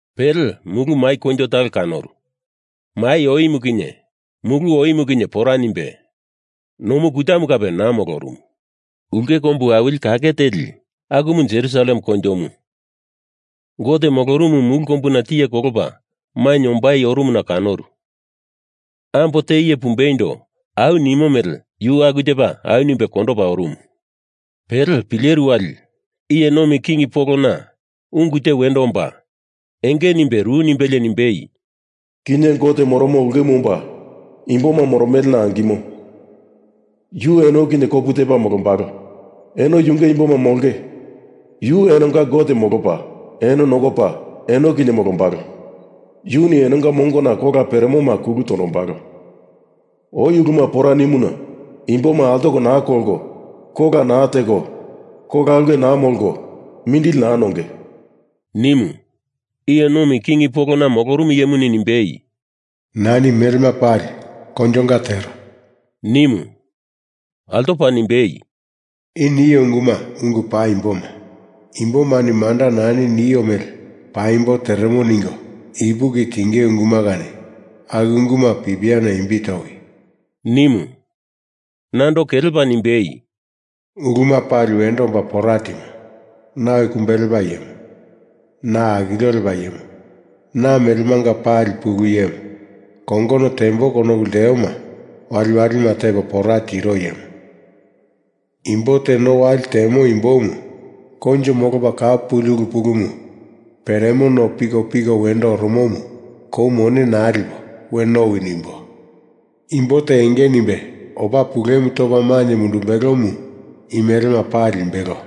Pele mulu mai koinjo talo kanoru. Mai oimu kinye mulu oimu kinye pora nimbe, nomu kutamu kape naa molorumu. Ulke kombu awili kake teli, akumu Jerusalem koinjomu, Gote molorumu mulu kombuna tiye kolopa mainye ombai orumuna kanoru. Ambo te iye pumbeindo au nimo mele yu aku tepa au nimbe kondopa orumu. Pele pileru wali iye nomi king polona ungu te wendo omba enge nimbe ru nimbelie nimbe, “Kinye Gote moromo ulkemu omba imboma moromelena angimo, yu eno kinye kopu tepa molombalo. Eno yunge imboma molonge, yu enonga Gote molopa eno nokopa, eno kinye molombalo. Yuni enonga mongona kola peremoma kulu tondombalo. Oi uluma pora nimuna imboma altoko naa kolko, kola naa teko, kola ulke naa molko, mindili naa nonge,” nimu. Iye nomi king polona molorumu iyemuni nimbei, “Nani melema pali koinjonga tero,” nimu. Altopa nimbei, “I nio unguma ungu paimboma, imbomani manda nani nio mele paimbo teremo ningo ipuki tingei unguma kani aku unguma pipiana imbi towi!” nimu. Nando kelepa nimbei, “Uluma pali wendo omba pora timo. Na Oi Kumbe Lepa Iyemu, Na akilio lepa Iyemu; Na melemanga pali Pulu Iyemu, kongono tembo konopu lteoma waliwalima tepo pora tiro Iyemu. Imbo te no wali temo imbomu koinjo molopa kau puli ulu pulumu peremo no pikopiko wendo oromomu kou mone naa lipo we nowi nimbo. Imbo te enge nimbe opa pulemu topa mainye mundumbelomu i melema pali limbelo,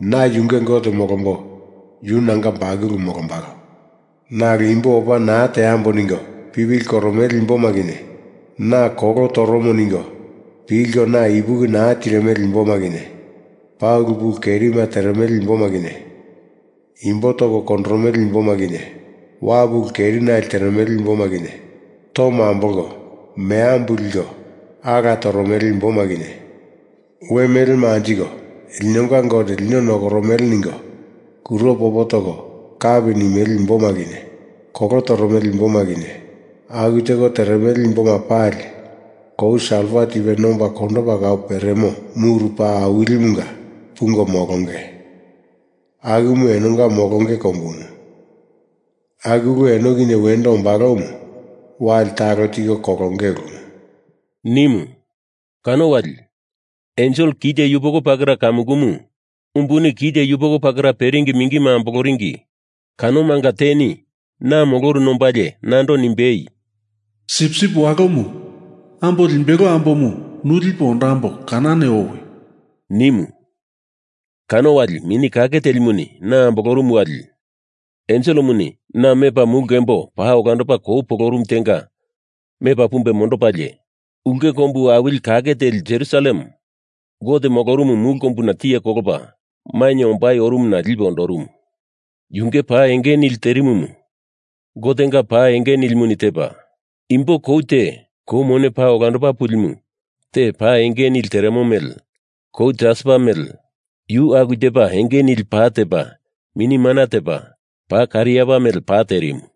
na yunge Gote molombo, yu nanga bakulumu molombalo. Nalo imbo opa naa teambo ningo pipili koromele imboma kinye, na kolo toromo ningo pilko na ipuki naa tirimele imboma kinye, paa ulu pulu kerima teremele imboma kinye, imbo toko kondoromele imboma kinye, wapu ulu kerinali teremele imboma kinye, tomo ambolko meambu liko ala toromele imboma kinye, we melema anjiko linonga Gote lino nokoromele ningo kuro popo toko kapi nimele imboma kinye, kolo toromele imboma kinye, aku teko teremele imboma pali kou salfa tipe nomba kondopa kau peremo muru paa awilimunga pungo molonge, akumu enonga molonge kombumu. Aku ulu eno kinye wendo ombalomu wali talo tiko kolonge ulumu,” nimu. Kano wali ensel kite yupoko pakera kamukumu umbuni kite yupoko pakera perimu mingima amboloringi kanomanga teni na moloruna ombalie nando nimbei, “Sipsip Walomu Ambo Limbelo Ambomu, nu lipo ondamboi, kanani owi!” nimu. Kano wali Mini Kake Telimuni na ambolorumu wali enselemuni na mepa mulu kembo paa olandopa kou polorumu tenga mepa pumbe mondopalie, ulke kombu awili kake teli Jerusalem Gote molorumu mulu kombuna tiye kolopa mainye ombai orumumu na lipe ondorumu. Yunge pa enge nili terimumu Gotenga pa enge nilimuni tepa, imbo kou te kou mone paa olandopa pulimu te pa enge nili teremo mele, kou jaspa mele, yu aku tepa enge nili pa tepa mini mana tepa, paa kariapa mele pa terimu.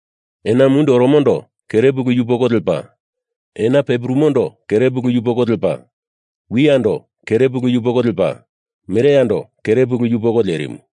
Ena mundi oromondo kere pulu yupoko lepa, ena pe purumondo kere pulu yupoko lepa, wiyando kere pulu yupoko lepa, mereyando kere pulu yupoko lerimu.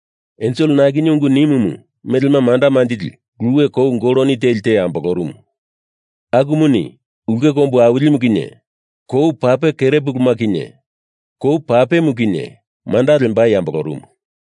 Ensel na kinye ungu nimumu melema manda manjili luwe kou goloni teli te ambolorumu. Akumuni ulke kombu awilimu kinye kou pape kere puluma kinye kou papemu kinye manda lembai ambolorumu.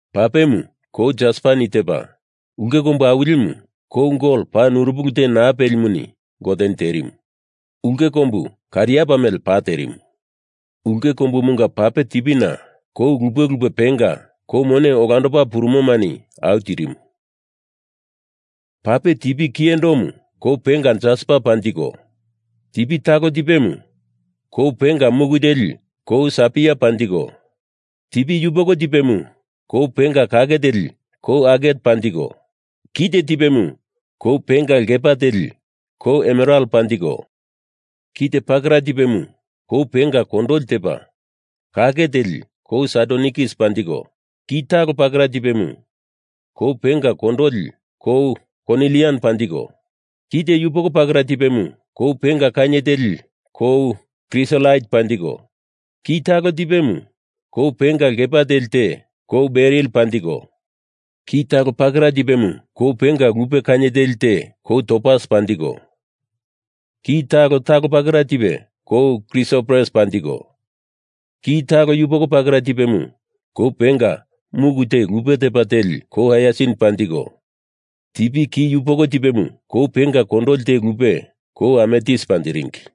Papemu kou jaspani tepa, ulke kombu awilimu kou gol paa nurupili te naa pelimuni Goteni terimu. Ulke kombu kariapa mele pa terimu. Ulke kombumunga pape tipina kou lupe lupe penga kou mone olandopa purumomani au tirimu. Pape tipi kiyendomu kou penga jaspa panjiko, tipi talo tipemu kou penga muku teli kou sapaia panjiko, tipi yupoko tipemu kou penga kake teli kou aget panjiko, kite tipemu kou penga lkepa teli kou emeral panjiko, kite pakera tipemu kou penga kondoli tepa kake teli kou sadonikis panjiko, kite talo pakera tipemu kou penga kondoli kou konilian panjiko, kite yupoko pakera tipemu kou penga kainye teli kou krisolait panjiko, ki talo tipemu kou penga lkepa teli te kou beril panjiko, ki talo pakera tipemu kou penga lupe kainye teli te kou topas panjiko, ki talo talo pakera tipe kou krisopres panjiko, ki talo yupoko pakera tipemu kou penga muku te lupe tepa teli kou haiasin panjiko, tipi ki yupoko tipemu kou penga kondoli te lupe kou ametis panjiringi.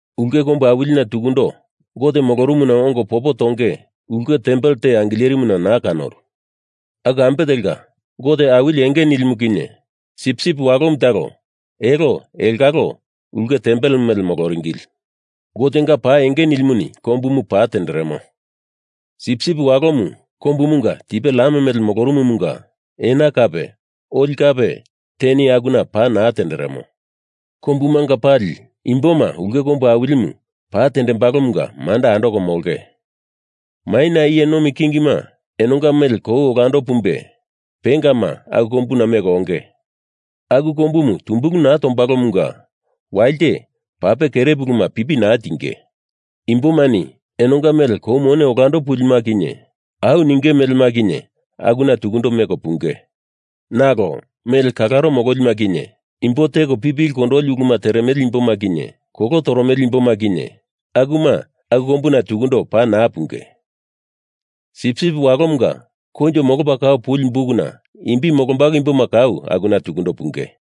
Ulke kombu awilina tukundo Gote molorumuna ongo popo tonge ulke tempel te angilerimuna naa kanoru. Aku ambe telka, Gote Awili Enge Nilimu kinye Sipsip Walomu talo elo elongalo ulke tempel mele moloringili. Gotenga pa enge nilimuni kombumu pa tenderemo, Sipsip Walomu kombumunga tipe lam mele molorumumunga ena kape oli kape teni akuna pa naa tenderemo. Kombumanga pali imboma ulke kombu awilimu pa tembalomunga manda andoko molonge. Maina iye nomi kingima enonga mele kou olando pumbe pengama aku kombuna meko onge. Aku kombumu tumbulu naa tombalomunga wali te pape kere puluma pipi naa tinge. Imbomani enonga mele kou mone olando pulima kinye au ninge melema kinye akuna tukundo meko punge. Nalo mele kalaro mololima kinye, imboma teko pipili kondoli uluma teremele imboma kinye, kolo toromele imboma kinye, akuma aku kombuna tukundo paa naa punge. Sipsip Walomunga koinjo molopa kau puli bukuna imbi molombalo imboma kau akuna tukundo punge.